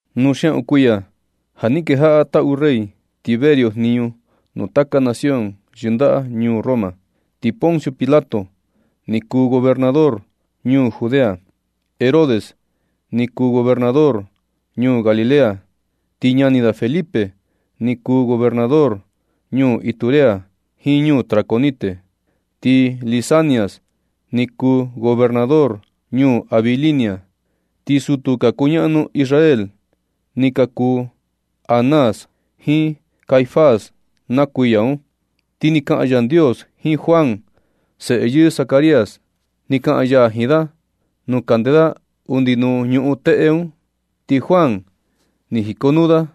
Nu xiaꞌun kuiya ja ni kenchaa taꞌu rey Tiberio jniñu nuu taka nación yɨndaꞌa ñuu Roma, ti Poncio Pilato ni kuu gobernador ñuu Judea, Herodes ni kuu gobernador ñuu Galilea, ti ñani da Felipe ni kuu gobernador ñuu Iturea jiin ñuu Traconite, ti Lisanias ni kuu gobernador ñuu Abilinia. Ti sutu ka kuñaꞌnu Israel ni ka kuu Anás jiin Caifás na kuiya un. Ti ni kaꞌan Yandios jiin Juan, seꞌe yɨɨ Zacarías. Ni kaꞌan ya jiin da nuu kande da undi nuu ñuꞌun teꞌe un. Ti Juan ni jikonuu da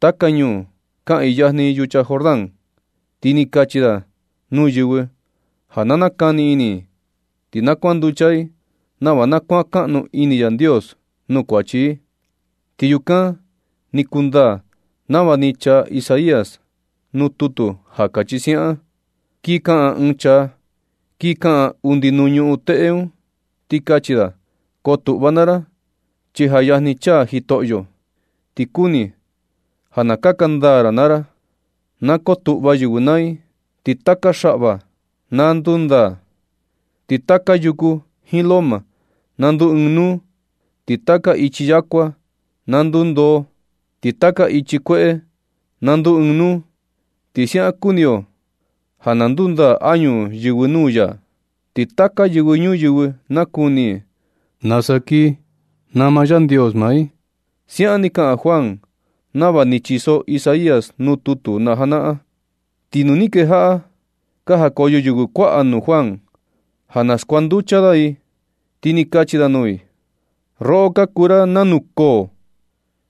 taka ñuu kaꞌiin yajni yucha Jordán, ti ni kachi da nuu yɨvɨ ja na nakani ini i, ti na kuanducha i nava na kuankaꞌnu ini Yandios nuu kuachi i. Ti yukan ni kundaa nava ni chaa Isaías nuu tutu ja kachi siaꞌan: Kin kaꞌan ɨɨn chaa, kin kaꞌan undi nuu ñuꞌun teꞌe un, ti kachi da: Kotuꞌva naa ra, chi ja yajni chaa Jitoꞌyo. Ti kuni ja na kaka ndaa ra naa ra. Na kotuꞌva yɨvɨ naa i, ti taka xaꞌva na ndundaa, ti taka yuku jiin loma na ndu ɨɨn nuu, ti taka ichi yakua na ndundoo, ti taka ichi kueꞌe na nduu ɨɨn nuu. Ti siaꞌan kuni yo ja na ndundaa añu yɨvɨ nuu ya. Ti taka yɨvɨ ñuyɨvɨ nakuni i nasa kii nama Yandios maa i. Siaꞌan ni kaꞌan Juan nava ni chiso Isaías nuu tutu na janaꞌan. Ti nu ni ka kejaꞌa ka jakoyo yɨvɨ kuaꞌa nuu Juan ja na skuanducha da i, ti ni kachi da nuu i: ―Roꞌo, ka kuu ra nanu koo.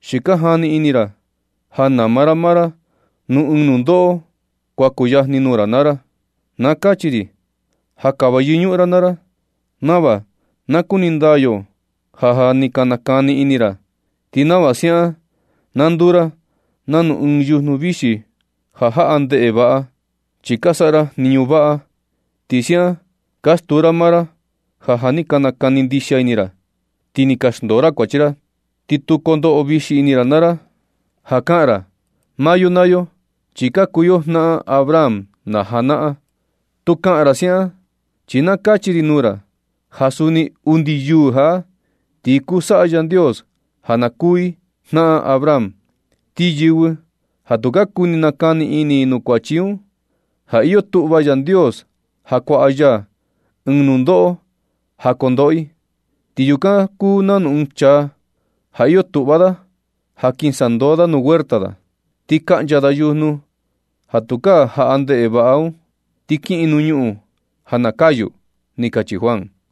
¿Xi ka jani ini ra ja nama ra maa ra nuu ɨɨn nundoꞌo kuan kuyajni nuu ra naa ra nu? Na kachi ri ja kava yɨñuꞌun naa ra nava na kuni ndaa yo ja, ja ni ka nakani ini ra. Ti nava siaꞌan na nduu ra nanu ɨɨn yujnu vixi ja jaꞌa ndeꞌe vaꞌa, chi ka saꞌa ra jniñu vaꞌa. Ti siaꞌan ka stuu ra maa ra ja, ja ni ka nakani ndixia ini ra, ti ni ka xndoo ra kuachi ra. Ti tu kondoꞌo vixi ini ra naa ra ja kaꞌan ra: “Maa yo naa yo chi ka kuu yo jnaꞌan Abraham na janaꞌan.” Tu kaꞌan ra siaꞌan, chi na kachi ri nuu ra ja suni undi yuu jaꞌa, ti kuu saꞌa Yandios ja na kuu i jnaꞌan Abraham. Ti yɨvɨ ja tu ka kuni nakani ini nuu kuachi un, ja iyo tuꞌva Yandios ja kuaꞌa ya ɨɨn nundoꞌo ja kondoꞌo i. Ti yukan kuu nanu ɨɨn chaa ja iyo tuꞌva da ja kin sandoo da nuu huerta da, ti kaꞌncha da yujnu ja tukaa jaꞌa ndeꞌe vaꞌa un, ti kiꞌin nuu ñuꞌun ja na kayu ―ni kachi Juan.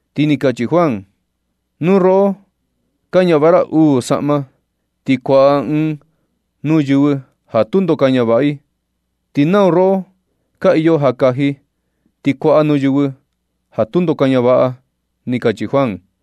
Ti ni kachi Juan: ―Nu roꞌo ka ñavaꞌa uu saꞌma, ti kuaꞌa ɨɨn nuu yɨvɨ ja tundo ka ñavaꞌa, ti nau roꞌo ka iyo ja kaji, ti kuaꞌa nuu yɨvɨ ja tundo ka ñavaꞌa ―ni kachi Juan.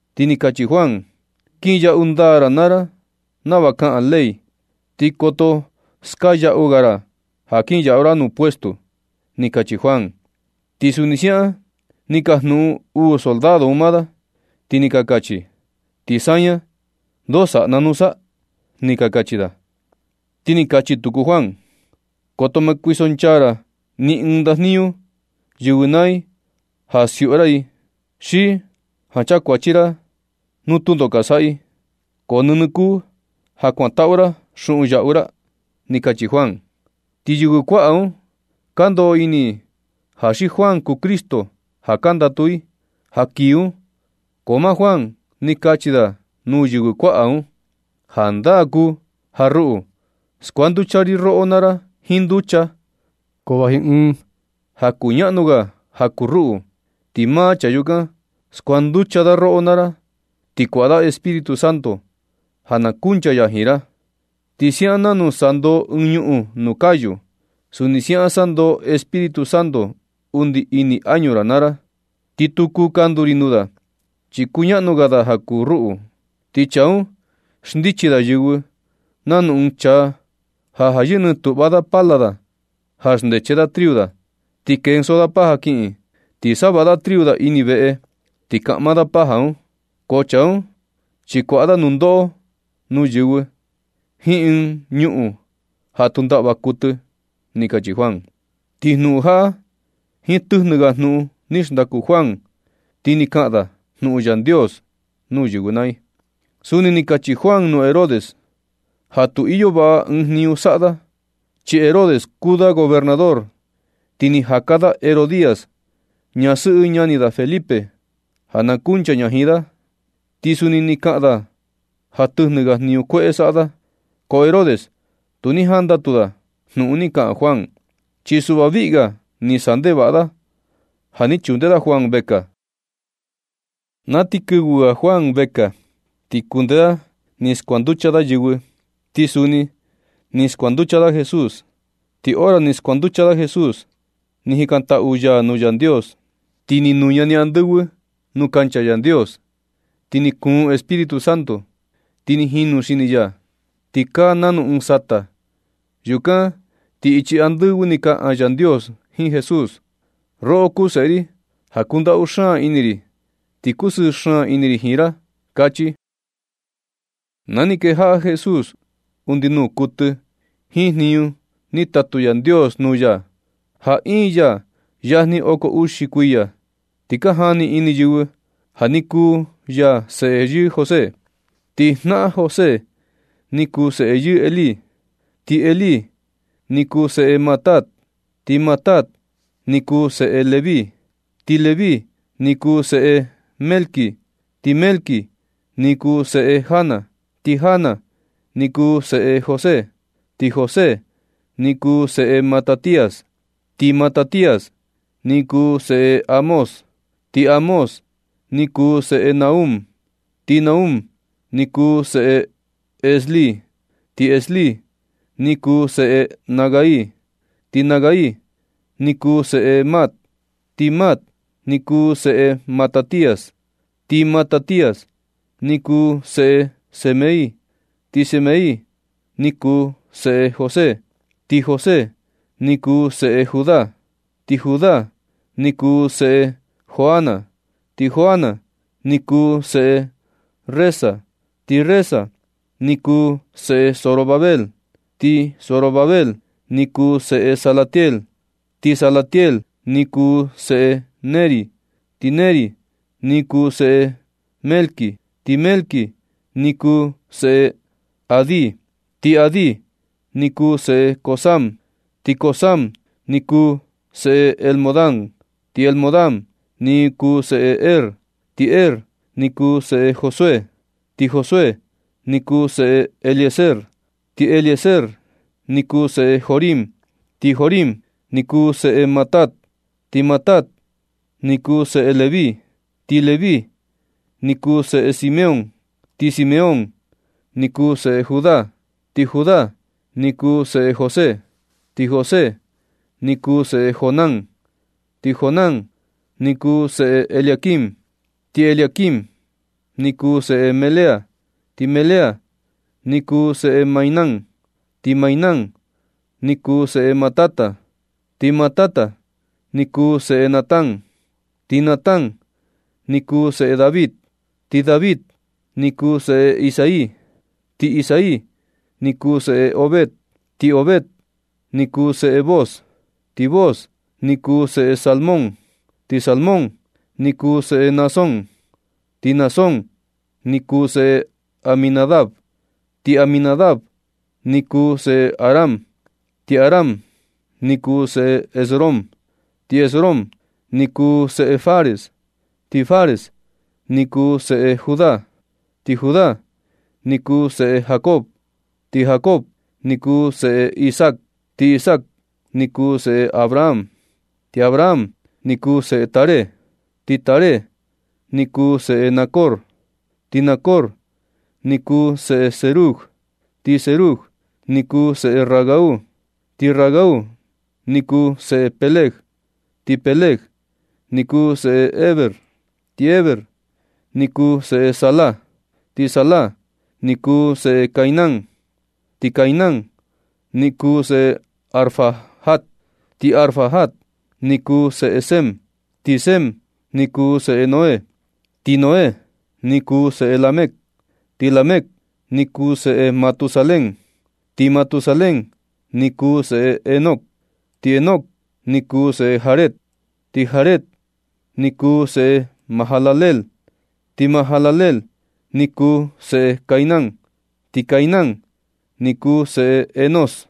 Ti ni kachi Juan: ―Kinyaꞌu ndaa naa ra nava kaꞌan ley, ti koto skaa yaꞌu ga ra ja kinyaꞌu ra nuu puesto ―ni kachi Juan. Ti suni siaꞌan ni ka jikajnuꞌun uu soldado un maa da, ti ni ka kachi: ―¿Ti saña, ndoo saꞌa na nusa? ―ni ka kachi da. Ti ni kachi tuku Juan: ―Koto ma kuisonchaa ra ni ɨɨn ndajniñu yɨvɨ naa i ja siuꞌu ra i, xi ja na chakuachi ra i nu tundo ka saꞌa i. So nɨnɨ kuu ja na kuantaꞌu ra xuꞌun yaꞌu ra ni ―ni kachi Juan. Ti yɨvɨ kuaꞌa un ka ndoꞌo ini i ja xi Juan kuu Cristo ja ka ndatu i ja kii un, ko maa Juan ni kachi da nuu yɨvɨ kuaꞌa un: ―Jandaa kuu ja ruꞌu skuanducha ri roꞌo naa ra jiin nducha, ko vaji ɨɨn ja kuñaꞌnu ga ja kuu ruꞌu, ti maa chaa yukan skuanducha da roꞌo naa ra, ti kuaꞌa da Espíritu Santo ja na kunchaa ya jiin ra. Ti siaꞌan nanu sandoo ɨɨn ñuꞌun nuu kayu, suni siaꞌan sandoo Espíritu Santo undi ini añu ra naa ra. Ti tu kuu kandu ri nuu da, chi kuñaꞌnu ga da ja kuu ruꞌu. Ti chaa un xndichi da yɨvɨ nanu ɨɨn chaa ja ja yɨjnɨ tuꞌva da pala da ja xndeche da triu da, ti kenso da paja kiꞌin ti savaꞌa da triu da ini veꞌe, ti kaꞌma da paja un. Ko chaa un, chi kuaꞌa da nundoꞌo nuu yɨvɨ jiin ɨɨn ñuꞌun ja tu ndaꞌva kuɨtɨ ―ni kachi Juan. Ti jnuꞌun jaꞌa jiin tɨjnɨ ga jnuꞌun ni xndaku Juan, ti ni kaꞌan da jnuꞌun Yandios nuu yɨvɨ naa i. Suni ni kachi Juan nuu Herodes ja tu iyo vaꞌa ɨɨn jniñu saꞌa da. Chi Herodes kuu da gobernador, ti ni jaka da Herodías, ñasɨꞌɨ ñani da Felipe, ja na kunchaa ña jiin da. Ti suni ni kaꞌan da ja tɨjnɨ ga jniñu kueꞌe saꞌa da. Ko Herodes, tu ni jandatu da jnuꞌun ni kaꞌan Juan, chi suꞌva viꞌi ga ni saꞌa ndevaꞌa da ja ni chunde da Juan vekaa. Na ti kɨvɨ ga Juan vekaa, ni kunde da ni skuanducha da yɨvɨ, ti suni ni skuanducha da Jesús. Ti hora ni skuanducha da Jesús ni jikantaꞌu ya nuu Yandios, ti ni nuña ni andɨvɨ nuu kancha Yandios, ti ni kuun Espíritu Santo, ti ni jinu xini ya, ti kaa nanu ɨɨn sata. Yukan ti ichi andɨvɨ ni kaꞌan Yandios jiin Jesús: ―Roꞌo kuu Seꞌe ri ja kundaꞌu xaan ini ri, ti kusɨɨ xaan ini ri jiin ra ―kachi. Na ni kejaꞌa Jesús undi nuu kuɨtɨ jiin jniñu ni tatu Yandios nuu ya, ja iin ya yajni oko uxi kuiya. Ti ka jani ini yɨvɨ ja ni kuu ya seꞌe yɨɨ José. Ti jnaꞌan José ni kuu seꞌe yɨɨ Elí, ti Elí ni kuu seꞌe Matat, ti Matat ni kuu seꞌe Leví, ti Leví ni kuu seꞌe Melqui, ti Melqui ni kuu seꞌe Jana, ti Jana ni kuu seꞌe José, ti José ni kuu seꞌe Matatías, ti Matatías ni kuu seꞌe Amós, ti Amós ni kuu seꞌe Nahum, ti Nahum ni kuu seꞌe Esli, ti Esli ni kuu seꞌe Nagai, ti Nagai ni kuu seꞌe Maat, ti Maat ni kuu seꞌe Matatías, ti Matatías ni kuu seꞌe Semei, ti Semei ni kuu seꞌe José, ti José ni kuu seꞌe Judá, ti Judá ni kuu seꞌe Joana, ti Joana ni kuu seꞌe Resa, ti Resa ni kuu seꞌe Zorobabel, ti Zorobabel ni kuu seꞌe Salatiel, ti Salatiel ni kuu seꞌe Neri, ti Neri ni kuu seꞌe Melqui, ti Melqui ni kuu seꞌe Adi, ti Adi ni kuu seꞌe Cosam, ti Cosam ni kuu seꞌe Elmodam, ti Elmodam ni kuu seꞌe Er, ti Er ni kuu seꞌe Josué, ti Josué ni kuu seꞌe Eliezer, ti Eliezer ni kuu seꞌe Jorim, ti Jorim ni kuu seꞌe Matat, ti Matat ni kuu seꞌe Leví, ti Leví ni kuu seꞌe Simeón, ti Simeón ni kuu seꞌe Judá, ti Judá ni kuu seꞌe José, ti José ni kuu seꞌe Jonán, ti Jonán ni kuu seꞌe Eliaquim, ti Eliaquim ni kuu seꞌe Melea, ti Melea ni kuu seꞌe Mainán, ti Mainán ni kuu seꞌe Matata, ti Matata ni kuu seꞌe Natán, ti Natán ni kuu seꞌe David, ti David ni kuu seꞌe Isai, ti Isai ni kuu seꞌe Obed, ti Obed ni kuu seꞌe Booz, ti Booz ni kuu seꞌe Salmón, ti Salmón ni kuu seꞌe Naasón, ti Naasón ni kuu seꞌe Aminadab, ti Aminadab ni kuu seꞌe Aram, ti Aram ni kuu seꞌe Esrom, ti Esrom ni kuu seꞌe Fares, ti Fares ni kuu seꞌe Judá, ti Judá ni kuu seꞌe Jacob, ti Jacob ni kuu seꞌe Isaac, ti Isaac ni kuu seꞌe Abraham, ti Abraham ni kuu seꞌe Taré, ti Taré ni kuu seꞌe Nacor, ti Nacor ni kuu seꞌe Serug, ti Serug ni kuu seꞌe Ragau, ti Ragau ni kuu seꞌe Peleg, ti Peleg ni kuu seꞌe Heber, ti Heber ni kuu seꞌe Sala, ti Sala ni kuu seꞌe Cainán, ti Cainán ni kuu seꞌe Arfaxad, ti Arfaxad ni kuu seꞌe Sem, ti Sem ni kuu seꞌe Noé, ti Noé ni kuu seꞌe Lamec, ti Lamec ni kuu seꞌe Matusalén, ti Matusalén ni kuu seꞌe Enoc, ti Enoc ni kuu seꞌe Jared, ti Jared ni kuu seꞌe Majalaleel, ti Majalaleel ni kuu seꞌe Cainán, ti Cainán ni kuu seꞌe Enós,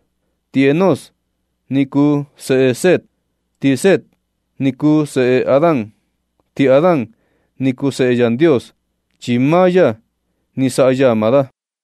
ti Enós ni kuu seꞌe Set, ti Set ni kuu seꞌe Adán, ti Adán ni kuu seꞌe Yandios, chi maa ya ni saꞌa ya maa da.